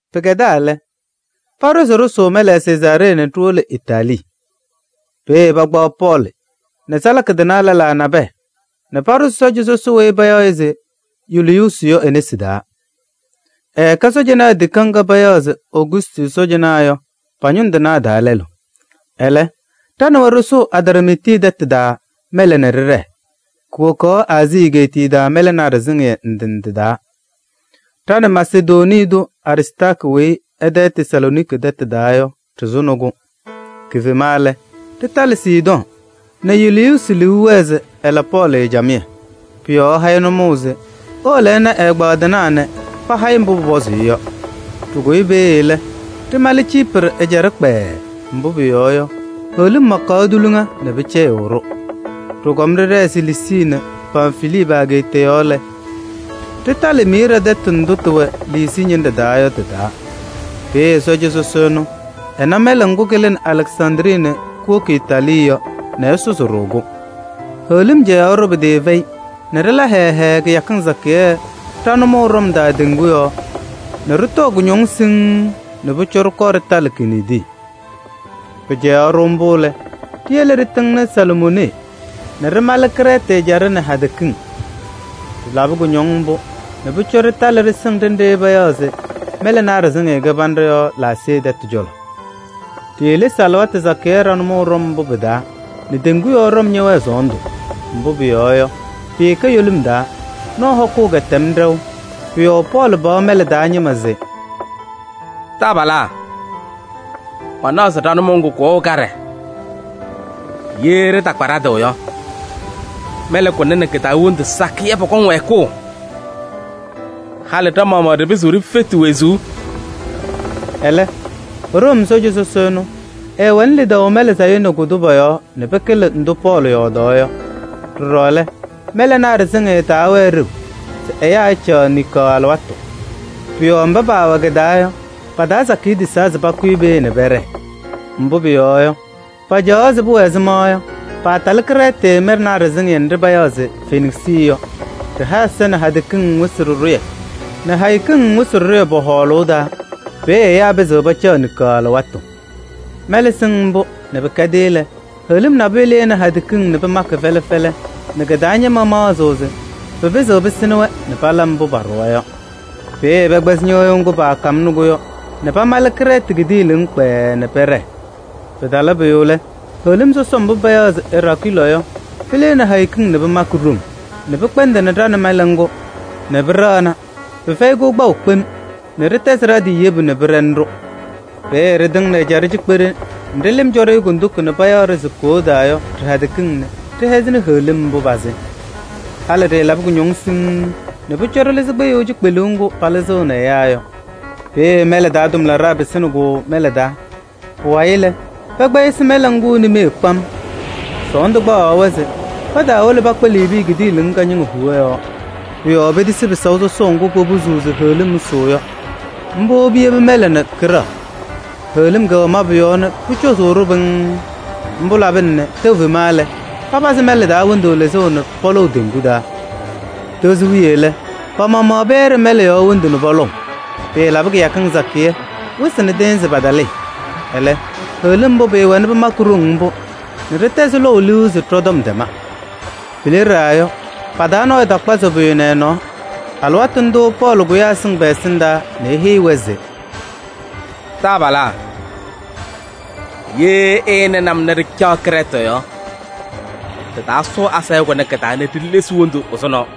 Pɩkɛdaa lɛ, paɖʋ se ɖɩsʋʋ mɛlɛ Sezaaree nɛ ɖiwolo Itaalii. Peeye pakpaɣ Pɔɔlɩ nɛ salaka tɩnaa lɛlaa nabɛyɛ nɛ paɖʋzɩ sɔɔja sɔsɔ weyi payaɣ se Yuliyuusi yɔ e-nesi taa. Ɛkɛ sɔɔjanaa tikaɣ ŋga payaɣ se: Ogustɩ sɔɔjanaa yɔ, pa-ñʋŋ tɩnaa taa lɛlʋ. Ɛlɛ ɖa nɛ wɛ ɖɩsʋʋ Adramiiti tɛtʋ taa mɛlɛ nɛ ɖɩɖɛɛ, kuwokaɣ Aazii egeetiye taa mɛlɛnaa ɖɩsɩŋɩyɛ ndɩ ndɩ taa. Ɖa nɛ Masedonii tʋ Aristaarkɩ weyi ɛ-tɛ Tesalooniki tɛtʋ taa yɔ ɖɩɩsʋnɩ-kʋ. Kifema lɛ, ɖɩtalɩ Sidɔɔ nɛ Yuliyuusi liu wɛɛ se ɛla Pɔɔlɩ camɩyɛ. Pʋ-yɔɔ ɛha-ɩ nʋmɔʋ se ewolo ɛna ɛ-ɛgbaadɩnaa nɛ paha-ɩ mbʋ pʋpɔzʋʋ-ɩ yɔ. Ɖɩkʋyɩ peeye lɛ, ɖɩmalɩ Ciiprɩ ɛjaɖɛ kpɛɛɛ, mbʋ pʋyɔɔ yɔ, heɣlim makaɣ tuliŋa nɛ pɩcɛyɩɣ-ɖʋ. Ɖɩkɔm ɖɩɖɛɛ Siliisii nɛ Pamfilii pa-ageeta yɔɔ lɛ, ɖɩtalɩ Miiraa tɛtʋ ndʋ tɩwɛ Liisii ñɩnɖɛ taa yɔ tɩ-taa. Peeye sɔɔja sɔsɔ ɛnʋ ɛna mɛlɛ ŋgʋ kɩlɩnɩ Alɛksandrii nɛ kuwoki Itaalii yɔ nɛ ɛsʋzɩ-ɖʋ-kʋ. Heɣlim cɛyaɣ-ɖʋ pɩtɩɩfɛyɩ nɛ ɖɩla hɛɛɛ hɛɛɛ kɩyakɩŋ sakɩyɛ ɖa-nʋmɔʋ ɖɔm taa teŋgu yɔɔ nɛ ɖɩtɔɔ kʋñɔŋ siŋŋ nɛ pʋcɔ ɖɩkɔɔ ɖɩtalɩ Kiniidi. Pɩcɛyaɣ-ɖʋ mbʋ lɛ, ɖiyele ɖɩtɩŋnɩ Salmonee nɛ ɖɩmalɩ Krɛɛtɩ ɛjaɖɛ nɛ hadɛ kiŋ. Ɖɩlabɩ kʋñɔŋ mbʋ nɛ pʋcɔ ɖɩtalɩ ɖɩsɩŋ ɖenɖe payaɣ se Mɛlɛnaa Ɖɩsɩŋɩyɛ Kɩbanɖɛ yɔ Laasee tɛtʋ cɔlɔ. Ɖiilesi alɩwaatʋ sakɩyɛ ɖa-nʋmɔʋ ɖɔm mbʋ pɩ-taa nɛ teŋgu yɔɔ ɖɔm ñɛwɛɛ sɔɔndʋ. Mbʋ pʋyɔɔ yɔ, pɩɩkɛ yolim taa: nɔɔ hɔkʋʋ kɛtɛm ɖɛʋ. Pʋ-yɔɔ Pɔɔlɩ paɣ mɛlɛ taa ñɩma se: “Taabalaa! Manaɣ se ɖa-nʋmɔʋ ŋgʋ kʋwɛɣ kaɖɛ, ye ɖɩtakpa ɖa-tɩ yɔ, mɛlɛ kʋnɛ nɛ kɩ-taa wondu sakɩyɛ pɔkɔŋ wɛɛkʋʋ, halɩ ɖa-maɣmaɣ ɖɩpɩzɩɣ ɖifeti wezuu.” Ɛlɛ Room sɔɔja sɔsɔ ɛnʋ, ɛɛwɛnɩ lidaʋ mɛlɛ sayʋ nɛ kʋ-tʋ pɔ-yɔɔ nɛ pɩkɩlɩ ndʋ Pɔɔlɩ yɔɔdaa yɔ. Ɖɔɖɔ lɛ, mɛlɛnaa ɖɩsɩŋɩyɛ taawɛɛ ɖeu se ɛyaa ɛcaɣ niŋkaɣ alɩwaatʋ. Pʋ-yɔɔ mba paawɛ kɩ-taa yɔ, pa-taa sakɩyɛ tisaa se pakʋyɩ peeye nɛ pɛɖɛɛ. Mbʋ pʋyɔɔ yɔ, pacaɣaɣ se pʋwɛ ɛzɩma yɔ, paatalɩ Krɛɛtɩ mɛlɛnaa ɖɩsɩŋɩyɛ nɖɩ payaɣ se Feniksɩ yɔ. Ɖɩha ɛza nɛ hadɛ kiŋ wɩsɩ ɖɩɖʋyɛ nɛ hayo kiŋ wɩsɩ ɖɩɖʋyɛ pɔ-hɔɔlʋʋ taa. Peeye ɛyaa pɩzɩɣ pacaɣ niŋkaɣ alɩwaatʋ. Mɛlɛ sɩŋ mbʋ nɛ pɩkɛdɩ lɛ, heɣlim nabʋyʋ lɩnɩ hadɛ kiŋ nɛ pɩmakɩ fɛlɛ fɛlɛ nɛ kɩ-taa ñɩma maɣzɩ se pɩpɩzɩɣ pɩsɩnɩ-wɛ nɛ pala mbʋ paaɖʋwa yɔ. Peeye pɛkpɛzɩ ñɩɣyʋʋ ŋgʋ paakamnɩ-kʋ yɔ nɛ pamalɩ Krɛɛtɩ kidiiliŋ kpɛɛɛ nɛ pɛɖɛɣ. Pɩtala pʋyʋ lɛ, heɣlim sɔsɔm mbʋ payaɣ se Eraakɩlɔɔ yɔ, pɩlɩnɩ hayo kiŋ nɛ pɩmakɩ ɖoŋ nɛ pɩkpɛndɩnɩ ɖa nɛ mɛlɛ ŋgʋ nɛ pɩɖɛɣna pɩfɛyɩ-kʋ kpaʋ kpem nɛ ɖɩtɛzɩ ɖa-tɩ yebu nɛ pɩɖɛnɩ-ɖʋ. Peeye ɖɩtɩŋnɩ ɛjaɖɛ cikpeɖe nɖɩ lɩm cɔ-ɖɩ kondiko nɛ payaɣ-ɖɩ se Koodaa yɔ ɖɩ-hadɛ kiŋ nɛ ɖɩhɛzɩnɩ heɣlim pazɩ. Halɩ ɖɩɩlabɩ kʋñɔŋ siŋŋ nɛ pʋcɔ ɖɩlɩzɩ kpɩyʋʋ cikpeluu ŋgʋ palɩzɩɣnɩ ɛyaa yɔ. Peeye mɛlɛ taa tʋmlaɖaa pɩsɩnɩ-kʋ mɛlɛ taa. Pʋwayɩ lɛ, pɛkpɛyɩsɩ mɛlɛ ŋgʋ nimee kpam. Sɔɔndʋ kpaɣaɣ-wɛ se pataawolo pakpa Liibii kidiiliŋ kañɩŋa huwa yɔɔ. Pʋ-yɔɔ petisi pɩsaʋ sɔsɔʋ ŋgʋ popuzuu se heɣlim ɛsʋʋ yɔ. Mbʋ piyebi mɛlɛ nɛ kɩɖɛɣ. Heɣlim kɛwɛ mabʋ yɔɔ nɛ pʋcɔzʋʋ-ɖʋ pɩŋŋ. Mbʋ labɩna nɛ tɛʋ fema lɛ, papazɩ mɛlɛ taa wondu lɩzʋʋ nɛ pɔlɔʋ teŋgu taa. Tozo wiye lɛ, pa-maɣmaɣ pɛyɛɖɩ mɛlɛ yɔɔ wondu nɛ pɔlɔʋ. Pɩɩlabɩ kɩyakɩŋ sakɩyɛ, wɩsɩ nɛ tɩɩnzɩ patalɩɩ. Ɛlɛ heɣlim mbʋ pʋwɛnɩ pɩmakɩ ɖoŋ mbʋ nɛ ɖɩtɛzɩ lɔʋ liu se ɖɔ-tɔm tɛma. Pileɖaa yɔ, pa-taa nɔɔyʋ takpazɩ pʋyʋ nɛ ɛ-nɔɔ. Alɩwaatʋ ndʋʋ Pɔɔlɩ kʋyaa ɛsɩŋ pɛ-ɛsɩndaa nɛ eheyi-wɛ se: “Taabalaa! Ye ɩɩnɩnɩ-m nɛ ɖɩcaɣ Krɛɛtɩ yɔ, ɖɩtaasʋʋ asayʋʋ kʋnɛ kɩ-taa nɛ ɖilesi wondu ɛzʋnɔ.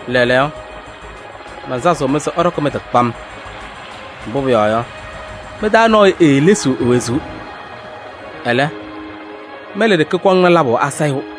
Lɛɛlɛɛyɔ, mansazɩɣ-mɩ se ɩɖɔkɩ mɩ-tɩ kpam. Mbʋ pʋyɔɔ yɔ, mɩ-taa nɔɔyʋ eelesiɣ e-wezuu. Ɛlɛ, mɛlɛ ɖeke kɔŋnɩ labʋ asayʋʋ.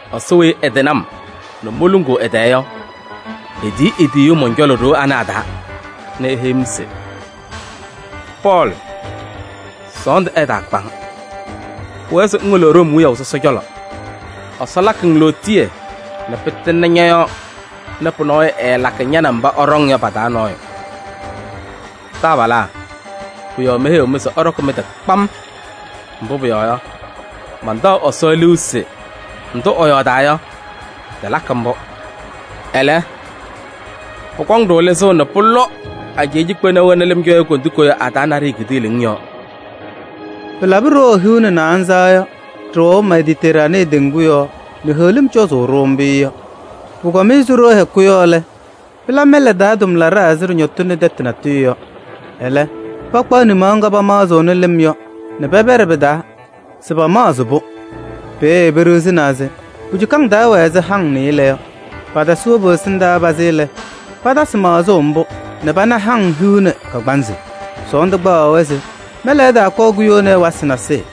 Ɛsɔ weyi ɛtɩnɩ-m nɛ moluŋuu ɛ-tɛɛ yɔ, etiyi e-tiyiyu mɔn-cɔlɔ ɖoo ana a-taa nɛ eheyi-m se: ‘Pɔɔlɩ! Sɔɔndʋ ɛtaakpa-ŋ. Pʋwɛɛ se ŋwolo Room wiyaʋ sɔsɔ cɔlɔ. Ɛsɔ lakɩ-ŋ lootiye nɛ pɩtɩŋnɩ ñɔ-yɔɔ nɛ pʋyʋ ɛɛlakɩ ña nɛ mba ɩɖɔŋ yɔ pa-taa nɔɔyʋ.’ Taabalaa! Pʋ-yɔɔ meheyiɣ-mɩ se ɩɖɔkɩ mɩ-tɩ kpam, mbʋ pʋyɔɔ yɔ, mantaɣ Ɛsɔ liu se ndʋ ɛyɔɔdaa yɔ, tɩlakɩ mbʋ. Ɛlɛ, pʋkɔŋ-ɖʋ lɩzʋʋ nɛ pʋlɔ ajɛɛ cikpena wena lɩm cɔ-yɛ kondiko yɔ a-taa naɖɩyɛ kidiiliŋ yɔɔ.” Pɩlabɩ ɖoo hiu nɛ naanza yɔ, ɖɩwɛʋ Mediteraanee teŋgu yɔɔ nɛ heɣlim cɔzʋʋ-ɖʋ mbʋ yɔ. Pʋkɔm ɛzɩ ɖoo hɛkʋ yɔ lɛ, pɩla mɛlɛ taa tʋmlaɖaa ɛzɩ ɖɩñɔtɩnɩ tɛtʋ natʋyʋ yɔ. Ɛlɛ pakpaɣ nimaɣ ŋga pamaɣzɩɣnɩ lɩm yɔ nɛ pɛpɛɖɩ pɩ-taa se pamaɣzɩ-pʋ. Peeye peɖiɣzinaa se pu-cukaŋ taa wɛ ɛzɩ haŋ nɩɩlɛ yɔ. Patasɩ wobu ɛsɩndaa pazɩ lɛ, patasɩ maɣzʋʋ mbʋ nɛ pana haŋ hiu nɛ kagbaanzɩ. Sɔɔndʋ kpaɣaɣ-wɛ se mɛlɛ ɛtaakɔɔ kuyoni ɛwasɩ nasɩyɩ.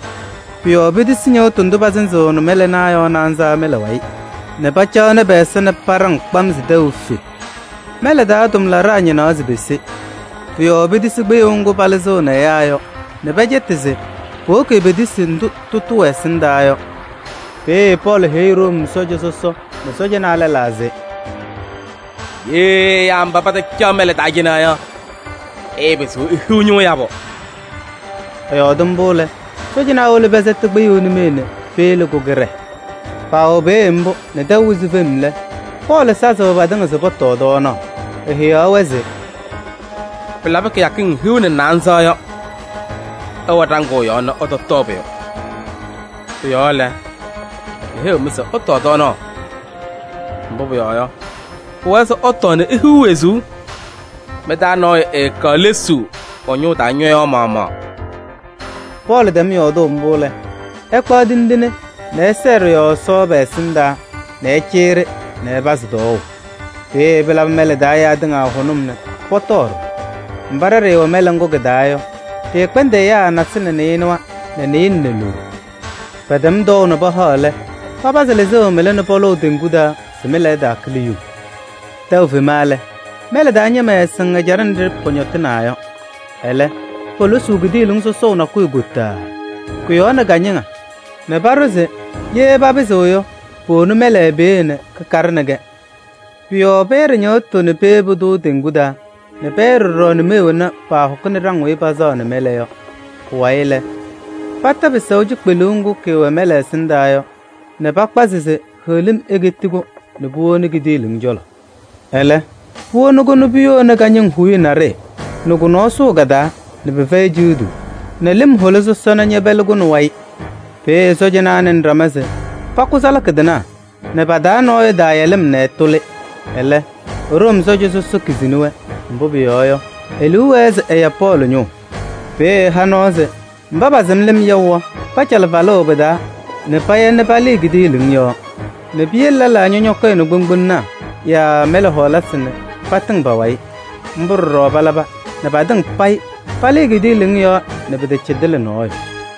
Pʋ-yɔɔ petisi ñɩɣtʋ ndʋ pasɩzɩɣnɩ mɛlɛnaa yɔ naanza mɛlɛ wayɩ nɛ pacaɣnɩ pɛ-ɛza paɖaŋ kpam se tɛʋ efe. Mɛlɛ taa tʋmlaɖaa ñɩnaɣ se pese. Pʋ-yɔɔ petisi kpɩyʋʋ ŋgʋ palɩzɩɣnɩ ɛyaa yɔ nɛ pɛcɛtɩ se powoki petisi ndʋ tʋtʋ wɛ ɛsɩndaa yɔ. Peeye Pɔɔlɩ heyi Room sɔɔja sɔsɔ nɛ sɔɔjanaa lɛlaa se: “Ye ɛyaa mba patacaɣ mɛlɛ taa cɩnɛ yɔ, ɩɩpɩzɩɣ ihiɣ ñʋʋ yabʋ.” Ɛyɔɔdɩ mbʋ lɛ, sɔɔjanaa wolo pɛsɛtɩ kpɩyʋʋ nimee nɛ peyebi-kʋ kɩɖɛɛ. Paawɛ peeye mbʋ nɛ tɛʋ wɩzɩ fem lɛ, Pɔɔlɩ sazɩ patɩŋa se pɔtɔɔ tɔɔnaɣ, eheyaɣ-wɛ se: “Pɩlabɩ kɩyakɩŋ hiu nɛ naanza yɔ, ɩwɛ ɖaŋʋʋ yɔɔ nɛ ɩtɔtɔɔ pʋyʋ. Pʋ-yɔɔ lɛ, meheyiɣ-mɩ se ɩtɔɔ tɔɔnaɣ. Mbʋ pʋyɔɔ yɔ, pʋwɛɛ se ɩtɔɔ nɛ ihiɣ wezuu, mɩ-taa nɔɔyʋ ɛɛkaɣ lesuu ɛ-ñʋʋ taa ñɔyaɣ maɣmaɣ.” Pɔɔlɩ tɛm yɔɔdʋʋ mbʋ lɛ, ɛkpaɣ tindine nɛ ɛsɛɛ ɖɩ-yɔɔ Ɛsɔ patɩŋa pɛ-ɛsɩndaa nɛ ɛcɩyɩ-ɖɩ nɛ ɛpazɩ tɔɔʋ. Peeye pɩlabɩ mɛlɛ taa ɛyaa tɩŋa hʋnʋm nɛ pɔtɔɔ ɖɔɖɔ. Mba ɖa ɖɩɩwɛ mɛlɛ ŋgʋ kɩ-taa yɔ, ɖɩɩkpɛndɩ ɛyaa naasɩlɛ nɛ nɩɩnʋwa nɛ nɩɩlɛ nɛ loɖo. Pɛtɛm tɔɔʋ nɛ pahaɣ lɛ, papazɩ lɩzʋʋ mɩla nɛ pɔlɔʋ teŋgu taa se mɛlɛ ɛtaakɩlɩ yuŋ. Tɛʋ fema lɛ, mɛlɛ taa ñɩma ɛɛsɩŋ ɛjaɖɛ nɖɩ pɔñɔtɩnaa yɔ. Ɛlɛ, polosuu kidiiliŋ sɔsɔʋ nakʋyʋ kotaaa, kʋ-yɔɔ nɛ kañɩŋa nɛ paɖʋ se ye papɩzɩɣ yɔ, powoni mɛlɛ peeye nɛ kɩkaɖɩnɩ-kɛ. Pʋ-yɔɔ pɛyɛɖɩ ñɩɣtʋ nɛ peyebi-tʋ teŋgu taa nɛ pɛyɛɖɩ ɖɔɖɔ nimee wena paahɔkɩnɩ ɖaŋ weyi pasaɣnɩ mɛlɛ yɔ. Pʋwayɩ lɛ, pata pɩsaʋ cikpeluu ŋgʋ kɩwɛɣ mɛlɛ ɛsɩndaa yɔ nɛ pakpazɩ se heɣlim eketi-kʋ nɛ puwoni kidiiliŋ cɔlɔ. Ɛlɛ, puwoni-kʋ nɛ puyoni kañɩŋa huuye naɖɩyɛ nɛ kʋ-nɔɔ sʋʋ ka-taa nɛ pɩfɛyɩ ciɣduu nɛ lɩm hola sɔsɔna ñɛpɛlɩ-kʋ nɛ wayɩ. Peeye sɔɔjanaa nɩnɩ ɖama se pakʋ salaka tɩnaa nɛ pa-taa nɔɔyʋ ɛtaaya lɩm nɛ ɛtʋlɩ. Ɛlɛ, Room sɔɔja sɔsɔ kizini-wɛ, mbʋ pʋyɔɔ yɔ, e-liu wɛɛ se ɛya Pɔɔlɩ ñʋʋ. Peeye ɛha nɔɔ se mba pasɩm lɩm yaʋ yɔ, pacalɩ falʋʋ pɩ-taa nɛ paya nɛ palɩɩ kidiiliŋ yɔɔ nɛ piyele lɛlaa ñɔñɔkɔyɩnɩ kpoŋgbolonaa yaa mɛlɛ hɔɔlasɩ nɛ patɩŋ pa-wayɩ. Mbʋ ɖɔɖɔ palaba nɛ patɩŋa payɩ palɩɩ kidiiliŋ yɔɔ, pɩtacɩdɩlɩ nɔɔyʋ.